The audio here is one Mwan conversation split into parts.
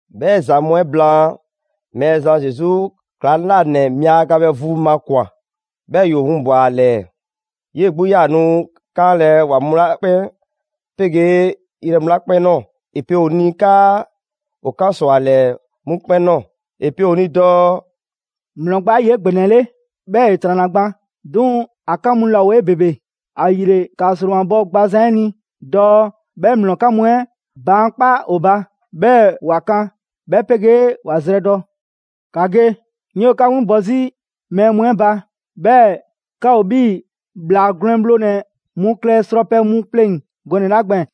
'Bhɛ ‑za mu 'ɛ blaan, Mɛɛzan Zesu ‑klaŋlanɛ mia yaga bhɛ vu makwan‑, 'bhɛɛ‑ ‑yoo winbwa‑ ‑a ‑lɛɛ. 'Yee‑ 'gbu 'yaa‑ nu 'kanlɛ‑ ‑wa mu 'la 'kpɛn 'pegee yrɛ mu 'la 'kpɛn ꞊nɔɔ ‑e pe ‑o ni 'kaa ‑o 'kan ‑sɔ ‑a ‑lɛɛ 'mu 'kpɛn ꞊nɔɔ. ‑E pe ‑o ni dɔɔ: «‑Mlɔ gba 'ɛ ‑yoo 'egbɛnɛle, 'bhɛɛ‑ ‑e ‑tranna gban, 'duŋ‑ ‑a 'kan mu laa ‑o 'ebebele. ‑Ayile ‑ka ‑sromabɔ gbazan 'ɛ ni dɔɔ 'bhɛ ‑mlɔ 'ɛ 'kan mu 'ɛ baankpa' ‑o ba, 'bhɛɛ‑ ‑wa kan, 'bhɛ 'pegee ‑wa zrɛdɔ. ‑Ka ge, 'ŋ 'yoo‑ 'ka 'winbɔ‑ 'zi mɛɛ mu 'ɛ ba, 'bhɛɛ‑ 'ka ‑o 'bhii‑ ‑bhlaa gwlɛn bhlonɛ‑ mu klɛ srɔpɛ mu pleŋ‑ gɔnɛ‑ 'la gbɛɛn‑.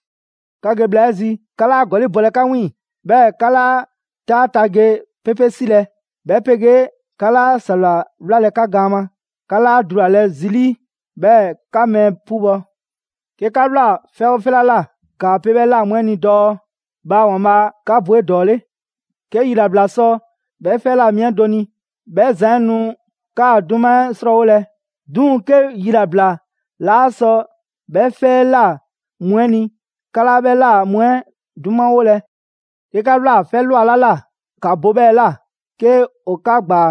'Ka ge bhla 'ɛ zi, 'ka 'laa ‑gɔli' bɔlɛ 'ka 'wiiŋ‑, 'bhɛɛ‑ 'ka 'laa 'taa ta ge 'pepe 'silɛ‑, 'bhɛ 'pegee 'ka 'laa ‑sawla 'wlalɛ‑ 'ka gaan ma. 'Ka 'laa dulalɛ zi 'lii, 'bhɛɛ‑ 'ka mɛɛ 'pubɔ‑. 'Ke 'ka ꞊wlaa 'fɛ 'oo 'fɛ 'la ꞊la, ‑kaa pe 'bhɛ ꞊la mu 'ɛ ni dɔɔ: ‹Bhaa ‑Waanbhaa' 'ka bɔ 'edɔɔle!› 'Ke yilabla sɔ 'bhɛ 'fɛ 'ɛ ꞊la mi 'ɛ do ni, 'bhɛ zan 'ɛ nu 'kaa‑ 'duma 'ɛ 'srɔɔwolɛ. 'Duŋ‑ 'ke yilabla 'laa sɔ 'bhɛ 'fɛ 'ɛ ꞊la mu 'ɛ ni, 'ka 'laa 'bhɛ ꞊la mu 'ɛ 'dumawolɛ. 'Ke 'ka ꞊wlaa 'fɛ ꞊lwa 'la ꞊la, ‑ka bo 'bhɛɛ‑ ꞊la, 'ke ‑o 'ka ‑gbaa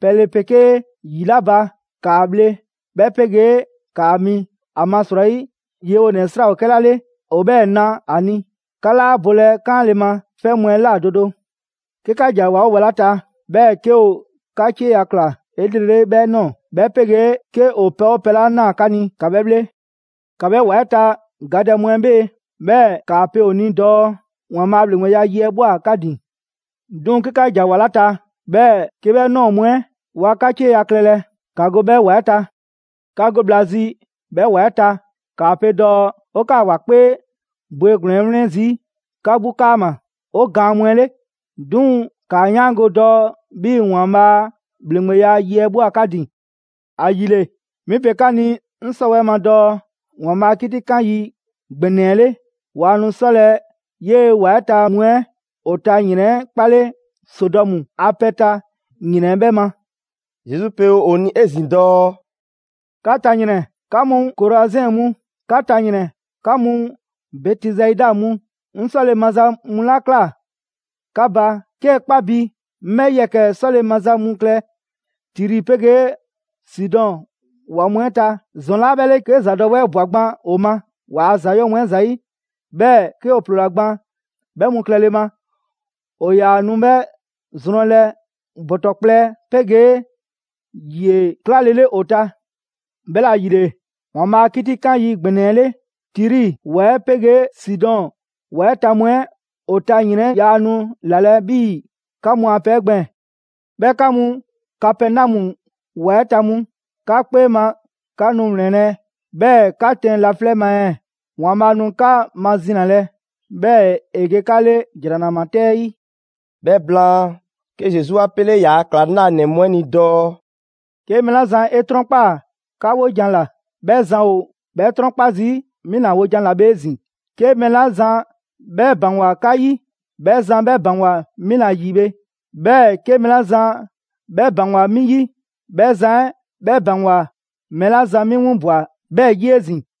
pɛle 'pegee ‑yi 'la ba, ‑kaa bhle 'bhɛ 'pegee ‑kaa mi. ‑Amasrɔyi, yewonɛ 'ɛ 'sra‑ ‑o 'kɛla 'le ‑o 'bhɛɛ‑ na ‑a ni. 'Ka 'laa bolɛ 'kaanle‑ ma 'fɛ mu ꞊la do do 'Ke 'ka ‑ja ‑wa 'oo ‑wa 'la ta, 'bhɛɛ‑ 'ke ‑o 'ka 'cieya‑ ꞊kla 'elrele 'bhɛ ꞊nɔɔ, 'bhɛ 'pegee 'ke ‑o pɛ 'oo pɛ 'la ꞊naa 'ka ni, ‑ka 'bhɛ 'bhle. ‑Ka 'bhɛ ‑wa 'ɛ ta gadɛ mu 'ɛ 'bhee‑, 'bhɛɛ‑ ‑kaa pe ‑o ni dɔɔ: ‹‑Waanbhaa' a ‑bhleŋgbeya yi 'ɛ ꞊bhwa 'ka ‑din.› 'Duŋ‑ 'ke 'ka ‑ja ‑wa 'la ta, 'bhɛɛ‑ 'ke 'bhɛ ꞊nɔɔ mu 'ɛ waa 'ka 'cieya‑ klɛlɛ, ‑ka go 'bhɛ ‑wa 'ɛ ta. 'Ka go bhla zi 'bhɛ ‑wa 'ɛ ta, ‑kaa pe dɔɔ: ‹'O 'kaa‑ ‑wa 'kpee bwegblɛn‑ 'ɛ 'wlɛn zii' 'ka 'gbu 'kaama‑ 'o gaan mu 'ɛ 'le. 'Duŋ‑ ‑kaa 'yaango‑ dɔɔ 'bhii‑ ‑Waanbhaa' a ‑bhleŋgbeya yi 'ɛ ꞊bhwa 'ka ‑din.› ‑Ayile 'mi pe 'ka ni 'ŋ 'sɔwɛɛ‑ ma dɔɔ ‑Waanbhaa' a 'kitikan yi ‑gbɛnɛ 'ɛ 'le, waa nu 'sɔlɛ‑ 'yee‑ ‑wa 'ɛ ta mu 'ɛ ‑o ta ‑yrɛn 'ɛ 'kpale Sodɔmu a pɛ ta ‑yrɛn 'ɛ 'bhɛ ma.» Zesu pe ‑o ni 'ezin‑ dɔɔ: «'Ka ta ‑yrɛn! 'Ka mu Korazɛn mu! 'Ka ta ‑yrɛn! 'Ka mu Bɛtisaida mu! 'Ŋ 'sɔle‑ maza mu 'la ꞊kla 'ka ba, 'kee‑ 'kpa bi 'ŋ 'bhɛ yɛkɛ‑ 'sɔle‑ maza mu klɛ Tiri 'pegee Sidɔn ‑wa mu 'ɛ ta, ‑zɔn 'laa 'bhɛ 'le 'ke ‑zadɔwɛɛ ꞊bwa gban ‑o ma ‑waa' ‑za 'yɔɔ‑ mu 'ɛ ‑zayi', 'bhɛɛ‑ 'ke ‑o ‑ploola gban 'bhɛ mu klɛle ma. ‑O ‑yaa nu 'bhɛ zrɔnlɛ ‑bɔtɔ kplɛ 'pegee ‑yie 'klalele ‑o ta. 'Bhɛla‑ ‑yile, ‑Waanbhaa' a 'kitikan yi ‑gbɛnɛ 'ɛ 'le, Tiri ‑wa 'ɛ 'pegee Sidɔn ‑wa 'ɛ ta mu 'ɛ ‑o ta ‑yrɛn 'ɛ yaa nu ‑lalɛ' 'bhii‑ 'ka mu a pɛ 'ɛ gbɛɛn‑. 'Bhɛɛ‑ 'ka mu Kapɛnɔmu ‑wa 'ɛ ta mu, 'ka 'kpee ma 'ka nu ‑wlɛnlɛ', 'bhɛɛ‑ 'ka tɛn laflɛ' ma ɛɛ? ‑Waanbhaa' nu 'ka mazinalɛ, 'bhɛɛ‑ ‑e ge 'ka 'le ‑jranama 'tɛ 'ɛ 'yi.» 'Bhɛ blaan, 'ke Zesu 'a 'pele ‑yaa' ‑klaŋlanɛ mu 'ɛ ni dɔɔ: «'Ke mɛɛ 'la zan 'e 'trɔnkpaa‑ 'ka 'wojan‑ ‑la, 'bhɛ zan ‑o 'bhɛ 'trɔnkpa zii' 'mi ‑la wojan 'ɛ 'la bhe 'ezin‑. 'Ke mɛɛ 'la zan 'bhɛ ‑baŋgwa 'ka 'yi, 'bhɛ zan 'bhɛ ‑baŋgwa 'mi ‑la ‑yi bhe. 'Bhɛɛ‑ 'ke mɛɛ 'la zan 'bhɛ ‑baŋgwa 'mi 'yi, 'bhɛ zan 'ɛ 'bhɛ ‑baŋgwa mɛɛ 'la zan 'mi 'winbwa‑ 'bhɛɛ‑ 'yi 'ezin‑.»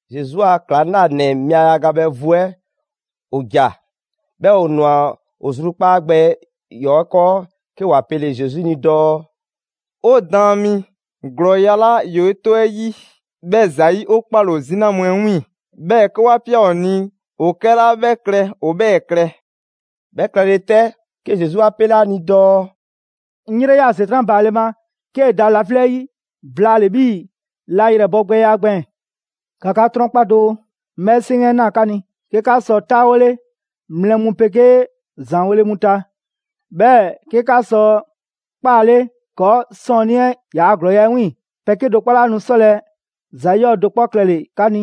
Zesu a ‑klaŋlanɛ mia yaga bhɛ vu 'ɛ ‑o ‑ja, 'bhɛɛ‑ ‑o ꞊nwa. ‑O zrukpaa' gbɛ ‑yɔɔ' 'ɛ 'kɔɔ 'ke ‑wa pele‑ Zesu ni dɔɔ: «'O Daan mi, ‑glɔɔya' 'la ‑yoo 'e 'tɔ 'ɛ 'yi 'bhɛ ‑zayi', 'o 'kpaale‑ ‑o 'zina mu 'ɛ 'wiiŋ‑; 'bhɛɛ‑ 'ke 'wa ꞊pia ‑o ni ‑o 'kɛla 'bhɛ klɛ ‑o 'bhɛɛ‑ klɛ.» 'Bhɛ klɛle 'tɛ, 'ke Zesu 'a 'pele ‑a ni dɔɔ: «'Ŋ 'yrɛ 'yaa‑ ‑Setran' baale ma 'kee‑ da laflɛ' 'yi blaale‑ 'bhii‑ la ‑yrɛbɔgbɛya 'ɛ gbɛɛn‑. ‑Ka 'ka 'trɔnkpa doo: 'ŋ 'bhɛ 'seŋ ꞊naa 'ka ni 'ke 'ka sɔ 'taawole mlɛ mu 'pegee ‑zaanweele mu ta, 'bhɛɛ‑ 'ke 'ka sɔ 'kpaale ‑kɔɔ' 'sɔɔnnii 'ɛ yaa ‑glɔɔya' 'ɛ 'wiiŋ‑. Pɛ 'kedo‑ 'kpɔ 'laa nu 'sɔlɛ‑ ‑za 'yɔɔ‑ do 'kpɔ klɛle‑ 'ka ni.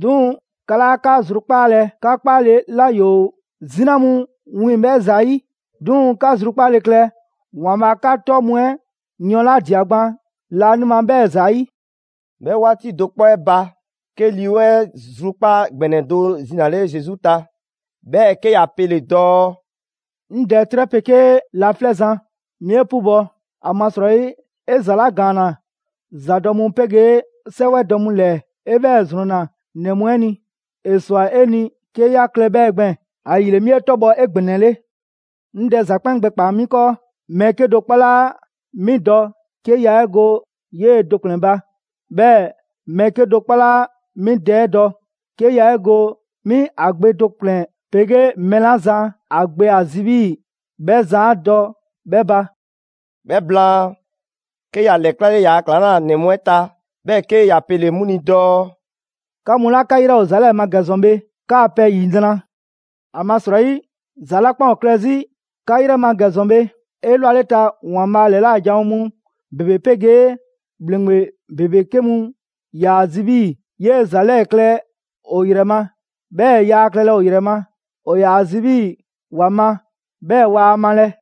'Duŋ‑, 'ka 'laa 'ka zrukpaalɛ 'ka 'kpaale‑ 'la ‑yoo 'zina mu wiiŋ‑ 'bhɛ ‑zayi'. 'Duŋ‑ 'ka zrukpaale klɛ ‑Waanbhaa' 'ka 'tɔ mu 'ɛ yɔɔn 'la ꞊dia gban laanima 'bhɛɛ‑ ‑zayi'.» 'Bhɛ 'waati do 'kpɔ 'ɛ ba, 'ke Lii 'Weŋ 'ɛ zrukpaa' ‑gbɛnɛ do zinale Zesu ta, 'bhɛɛ‑ 'ke ‑ya pele‑ dɔɔ: «'Ŋ Dɛ 'trɛ 'pegee laflɛ' Zan, 'mi 'e 'pubɔ, ‑amasrɔyi 'e ‑za 'la ‑gaanna ‑zadɔ' mu 'pegee 'sɛwɛdɔ mu ‑lɛɛ, 'e 'bhɛɛ‑ ‑zrɔnna ‑nɛ mu 'ɛ ni. ‑E ‑swa 'e ni 'ke 'ya klɛ 'bhɛ gbɛɛn‑, ‑ayile 'mi 'e 'tɔbhɔ‑ 'egbɛnɛle. «'Ŋ Dɛ ‑za 'kpɛn gbɛkpaa‑ 'mi 'kɔɔ. Mɛɛ 'kedo‑ 'kpɔ 'laa 'mi dɔ 'ke yaa 'e go 'yee‑ do ‑kplɛn ba. 'Bhɛɛ‑ mɛɛ 'kedo‑ 'kpɔ 'laa 'mi Dɛ 'ɛ dɔ 'ke yaa 'e go 'mi ‑a Gbe do ‑kplɛn, 'pegee mɛɛ 'la zan ‑a Gbe ‑a zi 'bhii‑ 'bhɛ zan 'a dɔ 'bhɛ ba.» 'Bhɛ blaan, 'ke ‑ya l‑ɛklale ‑yaa' ‑klaŋlanɛ mu 'ɛ ta, 'bhɛɛ‑ 'ke ‑ya pele‑ 'mu ni dɔɔ: «'Ka mu 'la 'ka 'yrɛ ‑o ‑za 'lɛɛ‑ ma ‑gɛ ‑zɔn bhe, 'kaa‑ pɛ ‑yinra'. ‑Amasrɔyi, ‑za 'la 'kpɛn ‑o klɛ 'zi 'ka yrɛ ma ‑gɛ ‑zɔn bhe, 'elwaleta ‑Waanbhaa' ‑lɛla' janwo mu ‑bebe 'pegee ‑bhleŋgbe ‑bebe 'ke mu ‑yaa zi 'bhii‑ 'yee‑ ‑za 'lɛɛ‑ klɛ ‑o ‑yrɛ ma, 'bhɛɛ‑ yaa klɛlɛ ‑o ‑yrɛ ma. ‑O ‑yaa zi 'bhii‑ ‑wa ma, 'bhɛɛ‑ waa malɛ.»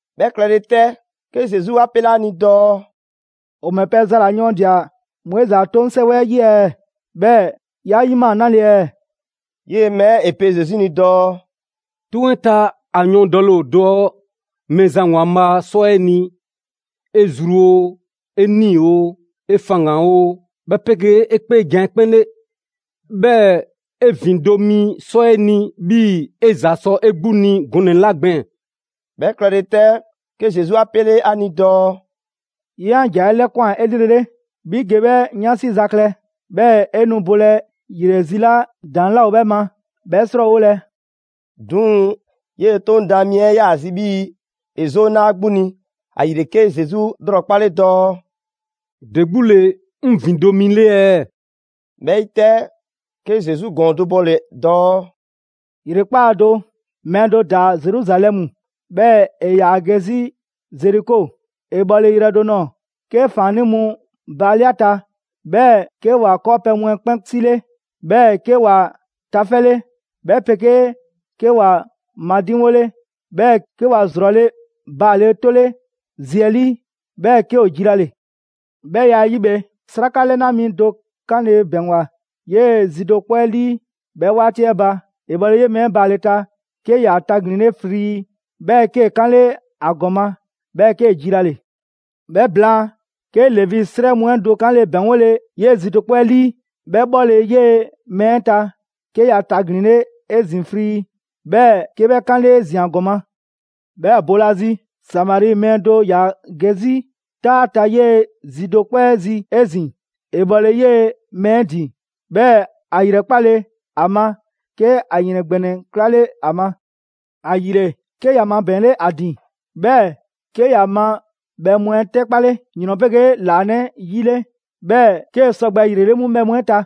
'Bhɛ klɛle 'tɛ, 'ke Zesu 'a 'pele 'a ni dɔɔ: «‑O ‑mɛ pɛ za ‑la yɔɔndia‑ ‑ Moizi a 'toŋ 'sɛwɛ 'ɛ 'yi ɛɛ? 'Bhɛɛ‑ 'ya 'yima‑ 'nale‑ ɛɛ?» 'Yee‑ mɛɛ 'ɛ ‑e pe Zesu ni dɔɔ: «'Toŋ 'ɛ ta, ‑a yɔɔndɛle ‑o dɔɔ Mɛɛzan ‑Waanbhaa' 'sɔ 'e ni 'e zru oo, 'e 'nii‑ oo, 'e faŋgan‑ oo 'bhɛ 'pegee 'e 'kpeejan‑ 'ɛ 'kpɛn 'le. 'Bhɛɛ‑ 'e ‑vindo' mi 'sɔ 'e ni 'bhii‑ 'e ‑za sɔ 'e 'gbu ni gɔnɛ‑ 'la gbɛɛn‑.» 'Bhɛ klɛle 'tɛ, 'ke Zesu 'a 'pele ‑a ni dɔɔ: «'Ye 'an ‑jan 'ɛ 'lɛkwan‑ 'elrele, 'bhi ge 'bhɛ 'yansi za klɛ, 'bhɛɛ‑ 'e nu bole ‑yrɛ ‑si 'la ‑daŋ' 'laa ‑o 'bhɛ ma 'bhɛ 'srɔɔwolɛ.» 'Duŋ‑ 'yee‑ 'Toŋ daan mi 'ɛ 'yaa‑ zi 'bhii‑ ‑e 'zoo 'na ‑a 'gbu ni, ‑ayile 'kee‑ Zesu 'lrɔkpale dɔɔ: «‑De 'gbu ‑le 'ŋ ‑vindo' mi 'le ɛɛ?» 'Bhɛ 'yi 'tɛ, 'ke Zesu ‑gɔɔn do bɔle‑ dɔɔ: «‑Yrekpaa' do, mɛɛ do ‑daa Zeruzalɛmu, 'bhɛɛ‑ ‑e ‑yaa ge 'zi Zeriko. ‑E bhɔle yrɛ do ꞊nɔɔ 'ke ‑faannii' mu baale' ‑a ta, 'bhɛɛ‑ 'ke ‑wa 'kɔɔpɛ‑ mu 'ɛ 'kpɛn 'sile, 'bhɛɛ‑ 'ke ‑wa tafɛle; 'bhɛ 'pegee 'ke ‑wa madiŋwole, 'bhɛɛ‑ 'ke ‑wa ‑zrɔle' baale 'tole zi 'ɛ 'lii, 'bhɛɛ‑ 'ke ‑o jilale. 'Bhɛ ya 'ɛ 'yi bhe, 'sraka 'lɛna mi do 'kanle‑ ‑bɛŋgwa 'yee‑ zi do 'kpɔ 'ɛ 'lii 'bhɛ 'waati 'ɛ ba. ‑E bhɔle 'yee‑ mɛɛ 'ɛ baale ta, 'ke ‑ya taglinle frii, 'bhɛɛ‑ 'kee‑ 'kanle 'a ‑gɔma, 'bhɛɛ‑ 'kee‑ jilale. 'Bhɛ blaan, 'ke Levi 'srɛ mu 'ɛ do 'kanle‑ ‑bɛŋgole 'yee‑ zi do 'kpɔ 'ɛ 'lii. 'Bhɛ 'bhɔle‑ 'yee‑ mɛɛ 'ɛ ta, 'ke ‑ya taglinle 'ezin‑ frii, 'bhɛɛ‑ 'ke 'bhɛ 'kanle 'ezin‑ ‑a ‑gɔma'. 'Bhɛɛ‑ boolazi, Samari mɛɛ do ‑yaa ge 'zi 'taa ta 'yee‑ zi do 'kpɔ 'ɛ zi 'ezin‑. ‑E bhɔle 'yee‑ mɛɛ 'ɛ ‑din, 'bhɛɛ‑ ‑a ‑yrɛkpale a ma, 'ke ‑a ‑yrɛn ‑gbɛnɛ 'klale ‑a ma. ‑Ayile, 'ke ‑ya mabɛɛnle 'a ‑din, 'bhɛɛ‑ 'ke ‑ya ma bhɛ mu 'ɛ 'tɛkpale ‑yrɔn 'pegee ‑laanɛ' 'yi 'le, 'bhɛɛ‑ 'kee‑ sɔgbɛ ‑yrele' 'mu bhɛ mu 'ɛ ta.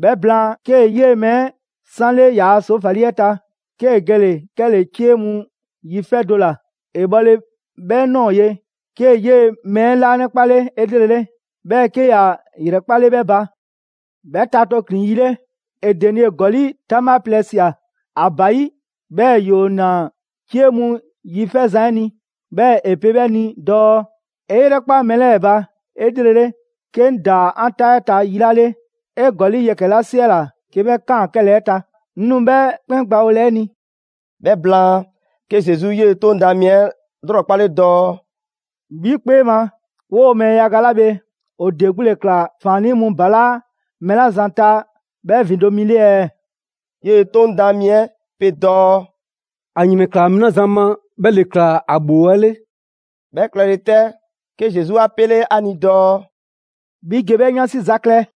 'Bhɛ blaan, 'kee‑ 'yee‑ mɛɛ 'ɛ 'sanle ‑yaa' ‑soofali 'ɛ ta, 'kee‑ gele‑ 'kɛle‑ 'cie mu yi 'fɛ do ‑la. ‑E bhɔle 'bhɛ ꞊nɔɔ ye, 'kee‑ 'yee‑ mɛɛ 'ɛ 'laanɛkpale 'elrele, 'bhɛɛ‑ 'ke ‑ya ‑yrɛkpale 'bhɛ ba. 'Bhɛ ta tooklin‑ yi 'le, ‑e denie ‑gɔli' 'taŋbha plɛ ꞊sia ‑a ba 'yi, 'bhɛɛ‑ ‑yoo ‑naa 'cie mu yi 'fɛzan‑ 'ɛ ni, 'bhɛɛ‑ ‑e pe 'bhɛ ni dɔɔ: ‹'E 'yrɛkpa mɛɛ 'lɛɛ‑ ba 'elrele, 'ke 'ŋ ‑daa 'an 'taa 'ɛ ta yi 'la 'le, 'e ‑gɔli' yɛkɛ‑ 'la 'siɛla‑ 'ke 'bhɛ kan 'kɛlɛɛ‑ ta, 'ŋ nu 'bhɛ 'kpɛn gbawolɛ 'e ni.›» 'Bhɛ blaan, 'ke Zesu 'yee‑ 'Toŋ daan mi 'ɛ 'lrɔkpale dɔɔ: «'Bhi 'kpee ma, 'woo‑ mɛɛ yaga 'la bhe, ‑o ‑de 'gbu ‑le ꞊kla ‑faannii' mu ‑balaa' mɛɛ 'la zan ta 'bhɛ ‑vindo' mi 'le ɛɛ?» 'Yee‑ 'Toŋ daan mi 'ɛ pe dɔɔ: «‑A ‑yrɛnklaa mɛɛ 'la zan ma, 'bhɛ ‑le ꞊kla ‑a ‑bhoo 'ɛ 'le.» 'Bhɛ klɛle 'tɛ, 'ke Zesu 'a pele ‑a ni dɔɔ: «'Bhi ge 'bhɛ 'yansi za klɛ.»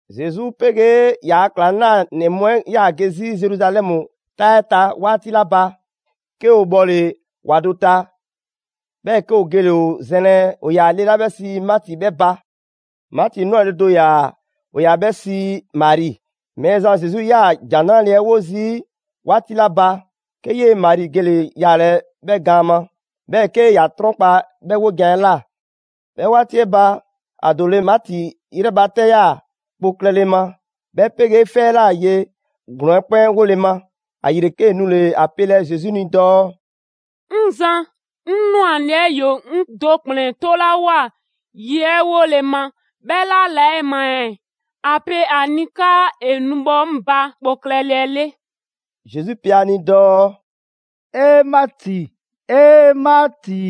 Zesu 'pegee ‑yaa' ‑klaŋlanɛ mu 'ɛ 'yaa‑ ge 'zi Zeruzalɛmu 'taa 'ɛ ta 'waati 'la ba, 'ke ‑o bhɔle‑ ‑wa do ta, 'bhɛɛ‑ 'ke ‑o gele‑ ‑o zɛnlɛ ‑o ‑yaa le 'la 'bhɛ sii Maati 'bhɛ ba. Maati 'nwale‑ do ‑yaa, ‑o ‑yaa 'bhɛ sii Mari. Mɛɛzan Zesu 'yaa‑ ‑Jan 'Nrale‑ 'ɛ 'wo zii' 'waati 'la ba, 'ke 'yee‑ Mari gele‑ yaalɛ 'bhɛ gaan ma, 'bhɛɛ‑ 'ke ‑ya 'trɔnkpa‑ 'bhɛ 'wojan‑ 'ɛ ꞊la. 'Bhɛ 'waati 'ɛ ba, ‑a ‑doole' Maati yrɛ ba 'tɛ 'yaa‑ kpo klɛle ma, 'bhɛ 'pegee 'fɛ 'ɛ ꞊la ye ‑glɔɔn 'ɛ 'kpɛn 'wole‑ ma. ‑Ayile 'kee‑ nule‑ ‑a pelɛ Zesu ni dɔɔ: «'Ŋ Zan, 'ŋ 'nwale‑ 'ɛ ‑yoo 'ŋ do ‑kplɛn 'tolawoa ye 'ɛ 'wole‑ ma, 'bhɛ 'laa la 'ɛ ma ɛɛ? ‑A pe ‑a ni 'kaa ‑e nu bhɔ 'ŋ ba kpo klɛle 'ɛ 'le.» Zesu pe ‑a ni dɔɔ: «'E Maati, 'E Maati!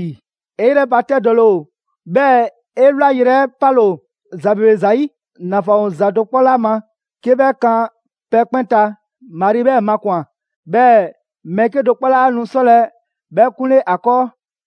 'E 'yrɛbatɛdɔle ‑o, 'bhɛɛ‑ 'e wlayrɛ 'ɛ 'pale‑ ‑o ‑za ‑bebe ‑zayi'. ‑Nafan ‑o ‑za do 'kpɔ ‑la ma, 'ke 'bhɛ kan pɛ 'kpɛn ta, Mari 'bhɛɛ‑ makwan‑, 'bhɛɛ‑ mɛɛ 'kedo‑ 'kpɔ 'laa nu 'sɔlɛ 'bhɛ 'kunle ‑a 'kɔɔ.»